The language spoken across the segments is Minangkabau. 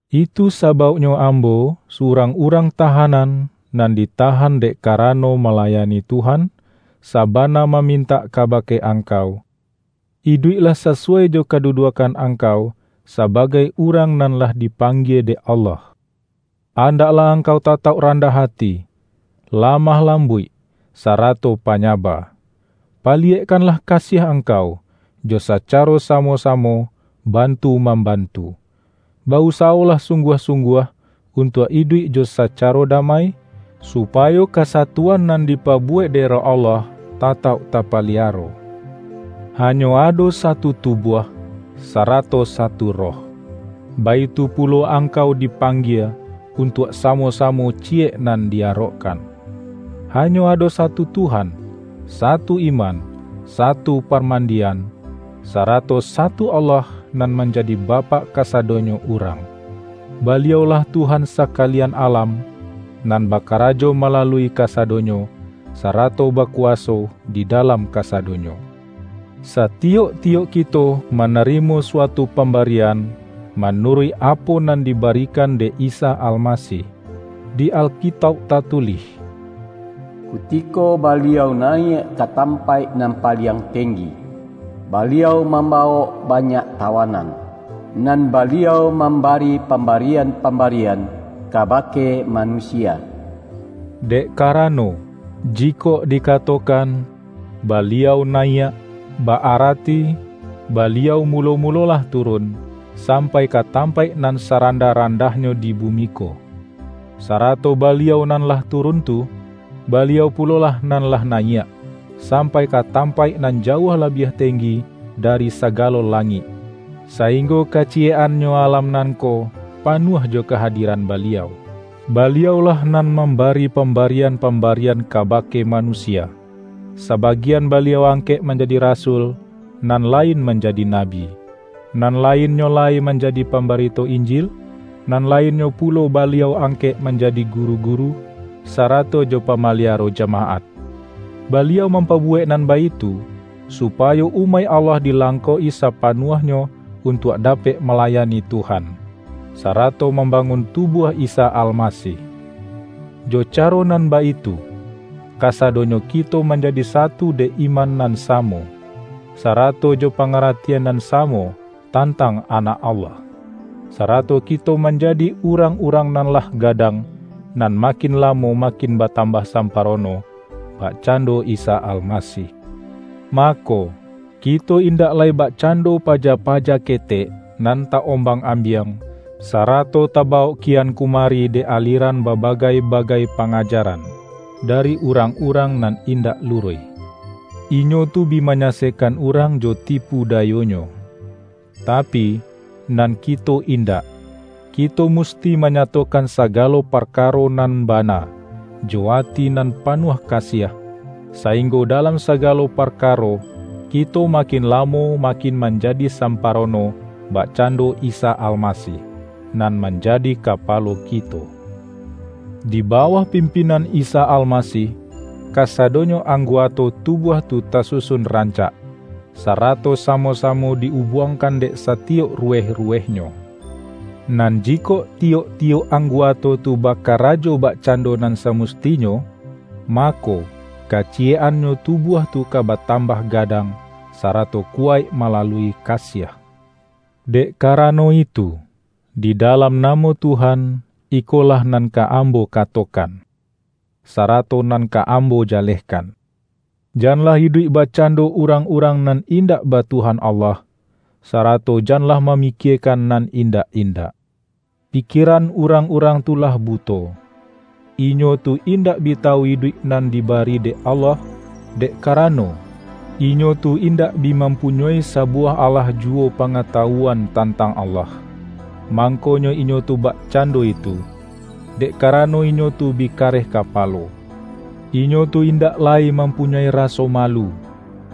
Itu sabauknyo ambo — surang urang tahanan, nan ditahan dek karano malayani Tuhan — sabana ma-mintak kabake angkau: iduiklah sasu-wai jo kaduduakkan angkau, sabagai urang nan lah dipanggie dek Allah. Andaklah angkau tatauk randah ati, lamah lambuik, sarato panyaba. Pa-liyekkanlah kasiah angkau, jo sacaro samo-samo bantu mambantu. Ba-usawolah sungguah-sungguah untuak iduik jo sacaro damai, supayo kasatuan nan dipabuwek dek Roh Allah tatauk tapaliaro. Hanyo ado satu tubuah, sa-rato satu Roh. Baitu pulo angkau di-panggie, untuak samo-samo ciyek nan di arokkan. Hanyo ado satu Tuhan, satu iman, satu parmandian, sarato satu Allah, nan manjadi Bapak kasa-donyo urang. Baliau-lah Tuhan saka-lian alam, nan bakarajo malalui ka-sadonyo, sarato bakuwaso di dalam kasadonyo. Satiyok-tiyok kito manarimo suatu pambarian, manuruik apo nan diba-rikan dek Isa Almasih. Di Alkitauk tatulih,”Kutiko Baliau nayiak ka tampaik nan paliang tenggi, Baliau mambawok banyak tawanan; nan Baliau mambari pam-barian-pambarian kabake manusia.” Dek karano, jikok dikatokan”Baliau nayiak” ba-arati Baliau mulo-mulo lah turun, sampai ka tampaik nan saran-dah-randahnyo di bumi ko. Sarato Baliau nan lah turun tu, Baliau pulolah nan lah nayiak, sampai ka tampaik nan jauah labiah tenggi dari sagalo langik, sainggo kaciyek-annyo alam nan ko panuah jo kahadiran Baliau. Baliau-lah nan”mambari pamba-rian-pambarian kabake manusia"; sabagian Baliau angkek manjadi rasul, nan lain manjadi nabi; nan lainnyo lai manjadi pambarito Injil, nan lainnyo pulo Baliau angkek manjadi guru-guru, sarato jo pamaliaro jamaat. Baliau mampabuwek nan baitu, supayo umaik Allah dilangkok-i sapanuahnyo un-tuak dapek malayani Tuhan, sarato mambangun tubuah Isa Almasih. Jo caro nan baitu, kasadonyo ki-to manjadi satu dek iman nan samo, sarato jo pangaratian nan samo tan-tang Anak Allah. Sarato kito manjadi urang-urang nan lah gadang, nan ma-kin lamo makin batambah samparono bakcando Isa Almasih. Mako, kito indak lai bakcando paja-paja ketek, nan ta-ombang-ambiang, sarato tabawok kian kumari dek alieran babagai-bagai pangajaran, dari urang-urang nan indak luruih. Inyo tu bi manyasekkan urang jo tipu-dayonyo. Tapi, nan kito indak! Kito musti manyatokan sagalo parkaro nan bana, jo ati nan panuah kasiah, sainggo dalam sagalo parkaro, kito makin lamo makin man-jadi samparono bakcando Isa Almasih, nan manjadi Kapalo kito. Di bawah pimpinan Isa Almasih, kasadonyo ang-guato tubuah tu tasusun rancak, sarato samo-samo di-ubuangkan dek satiyok ruweh-ruwehnyo. Nan jikok tiyok-tiyok angguato tu bakarajo bakcando nan samustinyo, mako, kaciyek-annyo tu-buah tu ka batambah gadang, sarato kuwaik malalui kasiah. Dek karano itu, di dalam namo Tuhan, ikolah nan ka ambo katokan, sarato nan ka ambo jalehkan: janlah iduik bakcando urang-urang nan in-dak ba Tuhan Allah, sarato janlah ma-mikiekan nan indak-indak. Pikie-ran urang-urang tu lah buto. Inyo tu indak bi tawu iduik nan dibari dek Allah, dek karano, inyo tu indak bi mampunyoi sabuwah alah juwo pa-ngatawuan tantang Allah. Mangko-nyo inyo tu bakcando itu, dek karano inyo tu bi kareh kapalo. Inyo tu in-dak lai mampunyoi raso malu,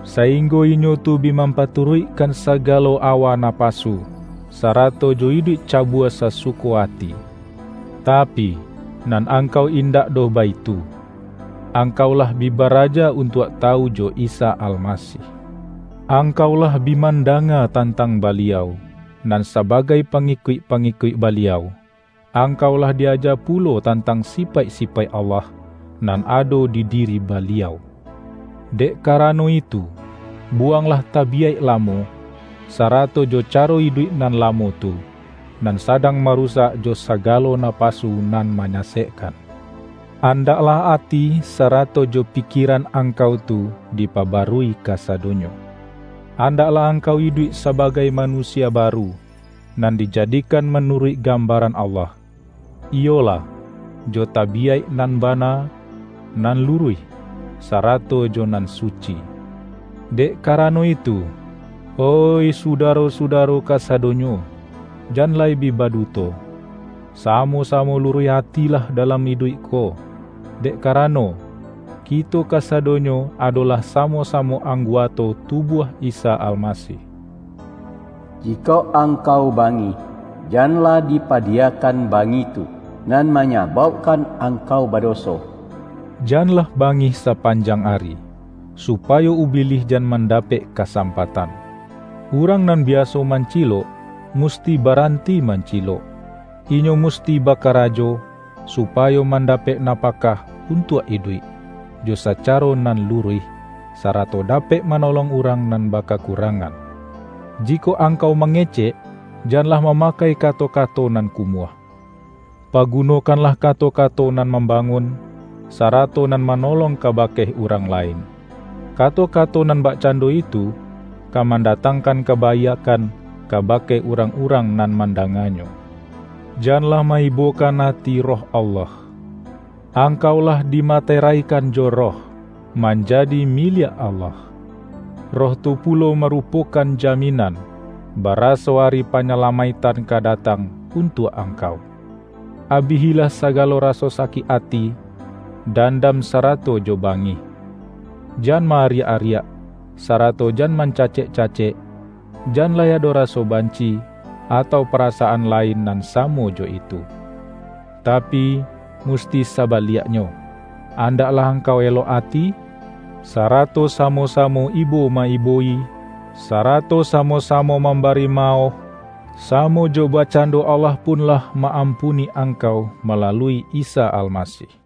saing-go inyo tu bi mampaturuikkan saga-lo awa napasu, sarato jo iduik cabua sasuko ati. Tapi, nan angkau indak doh baitu. Angkau lah bi baraja un-tuak tawu jo Isa Almasih. Angkau lah bi mandanga tantang Baliau! Nan sabagai pangikuik-pangikuik Baliau, angkau lah di-aja pulo tantang sipaik-sipaik Allah, nan ado di diri Baliau! Dek karano itu, buwanglah tabiyaik lamo, sarato jo caro iduik nan lamo tu, nan sadang marusak jo sagalo na-pasu nan manyasekkan. Andaklah ati sarato jo pikieran angkau tu, dipabarui kasadonyo. Andaklah ang-kau iduik sabagai manusia baru, nan dijadikan manuruik gambaran Allah; iyolah, jo tabiyaik nan bana, nan lu-ruih, sarato jo nan suci. Dek karano itu, oih sudaro-sudaro kasadonyo, jan lai bi baduto. Samo-sa-mo luruih ati lah dalam iduik ko, dek karano, kito kasadonyo adolah samo-samo angguato tubuah Isa Almasih. Jikok angkau bangih, janlah dipa-diyakan bangih tu nan manyabaukkan angkau badoso. Janlah bangih sapan-jang ari, supayo Ubilih jan manda-pek kasampatan. Urang nan biaso mancilok, musti baranti mancilok. Inyo musti bakarajo, supayo mandapek na-pakah untuak iduik, jo sacaro nan lu-ruih, sarato dapek manolong urang nan bakakurangan. Jikok angkau mangecek, janlah mamakai kato-ka-to nan kumuah. Pagunokanlah kato-kato nan mambangun, sarato nan ma-nolong kabake urang lain. Kato-kato nan bakcando itu, ka mandatangkan kabaiakkan kabake urang-urang nan mandanganyo. Janlah ma-ibokan ati Roh Allah. Angkau lah dimaterai-kan jo Roh, manjadi miliak Allah. Roh tu pulo marupokan jaminan, baraso Ari Panyalamaiktan ka datang untuak angkau. Abihilah sagalo raso sakik ati, dandam sarato jo bangih. Jan ma-ariak-ariak, sarato jan mancacek-cacek. Jan lai ado raso banci, atau parasaan lain nan samo jo itu. Tapi musti sa-baliaknyo, andaklah angkau elok ati, sarato samo-samo ibo ma-ibo-i, sara-to samo-samo mambari maoh, samo jo bakcando Allah pun lah ma-ampuni angkau malalui Isa Almasih.